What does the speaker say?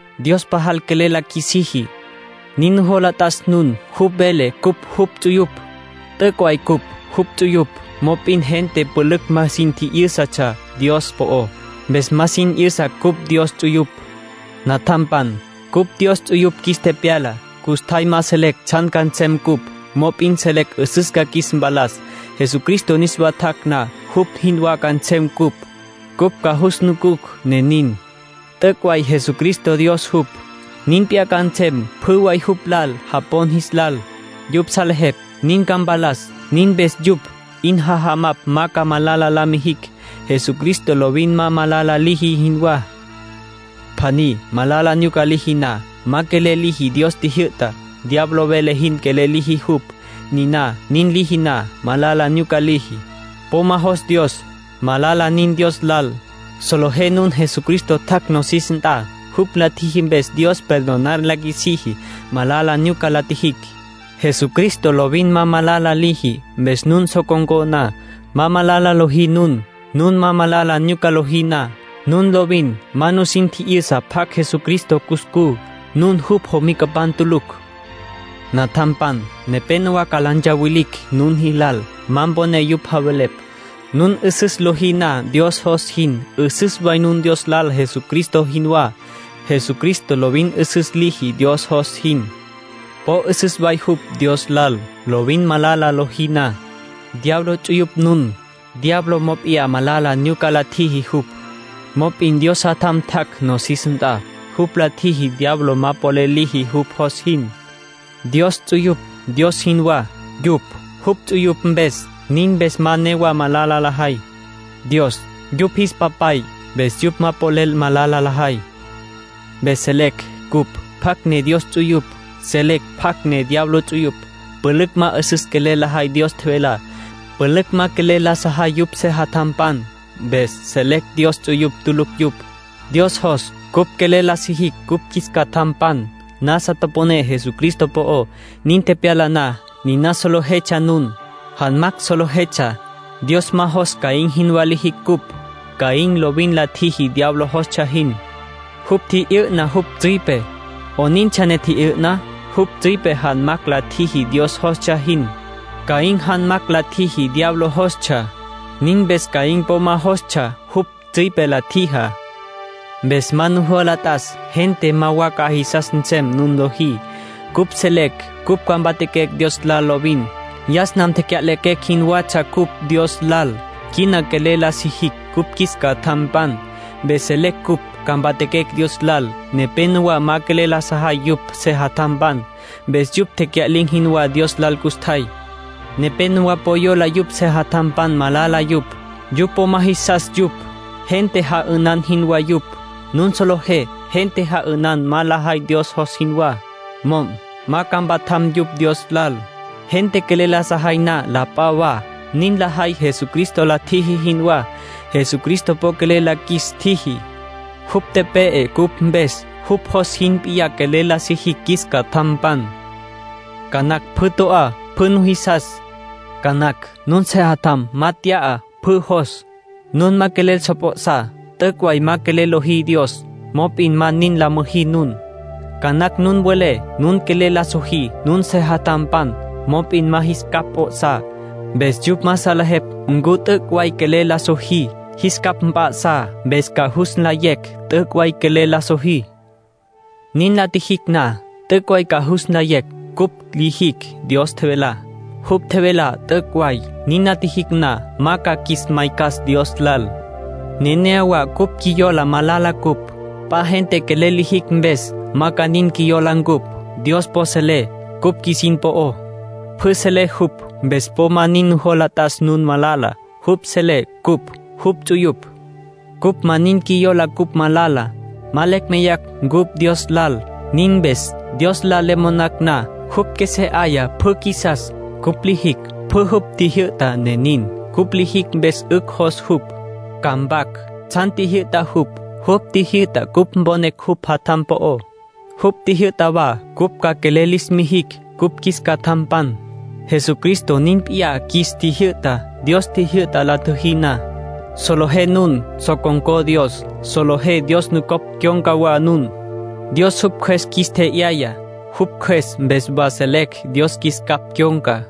Dios pajal quelel la qjuisiji. Nin nujola t'as nun. Jupj vele cupj jupj ts'uyupj. T'üc' way cupj jupj ts'uyupj. Mop'in gente pülücj ma sin tji'yǘsatsja Dios po'ó. Mpes ma sin 'yüsa cupj Dios ts'uyupj. Natjampan, cupj Dios ts'uyupj qjuis tepyala. Custjay ma selecj tsjan ca nsem cupj. Mop'in selecj 'üsüs ca qjuis mpalas. Jesucristo niswa tjac' na, jupj jinwá ca nsem cupj. Cupj ca jus nucucj, ne nin. T'üc' way Jesucristo Dios jupj. Nin p'iyá ca nsem pjü way jupj lal japon jis lal. Yupj salejepj nin ca mpalas. Nin mpes yupj 'in jajamapj ma ca malala la mijicj, Jesucristo lovin ma malala liji jinwá. Pjaní malala nyuca liji na, ma quelel liji Dios tjijyü'tá. Diablo vele jin quelel liji jupj. Niná nin liji na, malala nyuca liji. Po ma jos Dios. Malala nin Dios lal. Solejé nun Jesucristo tjac' nosis nt'a. Jupj la tjiji mpes Dios perdonar la qjuisiji malala nyuca la tjijicj. Jesucristo lovin ma malala liji. Mpes nun so con̈có na, ma malala lojí nun. Nun malala nyuca lojí na, nun lovin ma nusin tji'yüsa pjacj Jesucristo cuscú. Nun jupj jomicapan tulucj. Natjampan, nepénowa ca la ntsawilicj nun jilal. Ma mponé yupj javelepj. Nun 'üsüs lojí na Dios jos jin, 'üsüs way nun Dios lal Jesucristo jinwá. Jesucristo lovin 'üsüs liji Dios jos jin. Po 'üsüs way jupj Dios lal. Lovin malala lojí na, diablo ts'uyupj nun. Diablo mop'iyá malala nyuca la tjiji jupj. Mop'in Dios Jatjam tjac' nosis nt'a. Jupj la tjiji diablo ma polel liji jupj jos jin. Dios ts'uyupj Dios jinwá, yupj jupj ts'uyupj mpes; nin mpes ma newa malala lajay. Dios yupj jis Papay, mpes yupj ma polel malala lajay. Mpes selecj cupj pjacj ne Dios ts'uyupj. Selecj pjacj ne diablo ts'uyupj. Pülücj ma 'üsüs quelel lajay Dios tjevelá. Pülücj ma quelel la sajay yupj sejatjampan. Mpes selecj Dios ts'uyupj tulucj yupj. Dios jos cupj quelel la sijicj cupj qjuis catjampan. Nasa toponé Jesucristo po'ó. Nin tepyala na, niná solejetsja nun. Janmacj solejetsja. Dios ma jos Caín jinwá lijicj cupj. Caín lovin la tjiji diablo jostsja jin. Jupj tji'yü'na jupj tsüipe. ¿'Onintsja ne tji'yü'na? Jupj tsüipe janmacj la tjiji Dios jostsja jin. Caín janmacj la tjiji diablo jostsja. Nin mpes Caín po ma jostsja jupj tsüipe la tjijá. Mpes ma nujola t'as. Gente ma wa ca jisas nsem nun lojí. Cupj selecj cupj ca mpatjaquecj Dios lal lovin. Yas nam tecya'lequecj jinwatsja cupj Dios lal. Quina quelel la sijicj cupj qjuis catjampan, mpes selecj cupj ca mpatjaquecj Dios lal. Nepénowa ma quelel la sajay yupj sejatjampan, mpes yupj tecya'lin̈ jinwá Dios lal custjay. Nepénowa po yola yupj sejatjampan malala yupj. Yupj po ma jisas yupj. Gente ja'ünan jinwá yupj. Nun solejé gente ja'ünan ma lajay Dios jos jinwá. Mo'm ca ma mpatjam yupj Dios lal. Gente quelel la sajay na la p'a wa, nin lajay Jesucristo la tjiji jinwá. Jesucristo po quelel la qjuis tjiji. Jupj tepe'e cupj mpes. Jupj jos nin p'iyá quelel la sijicj qjuis catjampan. Ca nacj pjü to'á pjü nujisas. Ca nacj nun sejatjam ma tya'a pjü jos. Nun ma quelel so p'o'sá, t'üc' way ma quelel lojí Dios. Mop'in ma nin la müjí nun. Ca nacj nun welé nun quelel la sojí nun sejatjampan. Mop'in ma jis capj p'o'sá. Mpes yupj ma salejepj ncu t'üc' way quelel la sojí. ¡Jis capj mp'a'sá! Mpes ca jus nlayecj t'üc' way quelel la sojí. Nin la tjijicj na, t'üc' way ca jus nlayecj cupj lijicj Dios tjevelá. Jupj tjevelá t'üc' way. Nin la tjijicj na, ma ca qjuis maycas Dios lal. Nenéyawa cupj qjuiyola malala cupj. P'a gente quelel lijicj mpes, ma ca nin qjuiyola ncupj. Dios po selé cupj qjuisin po'ó; pjü selé jupj, mpes po ma nin nujola t'as nun malala. Jupj selé cupj jupj ts'uyupj. Cupj ma nin qjuiyola cupj malala, ma lecj meyacj ncupj Dios lal. Nin mpes, Dios lal le monacj na, jupj qjuesé 'aya pjü qjuisas. Cupj lijicj pjü jupj tjijyü'tá, ne nin. Cupj lijicj mpes 'ücj jos jupj. Ca mpac tsjan tjijyü'ta jupj. Jupj tjijyü'ta cupj mponecj jupj Jatjam po'ó. Jupj tjijyü'ta wa cupj ca quelel lis mijicj cupj qjuis catjampan. Jesucristo nin p'iyá qjuis tjijyü'ta. Dios tjijyü'ta la tjüjí na, solejé nun so con̈có Dios, solejé Dios nucopj cyon̈ca wa nun. Dios jupj Cjües qjuis tje'yaya. Jupj Cjües mpes wa selecj Dios qjuis capj cyon̈ca.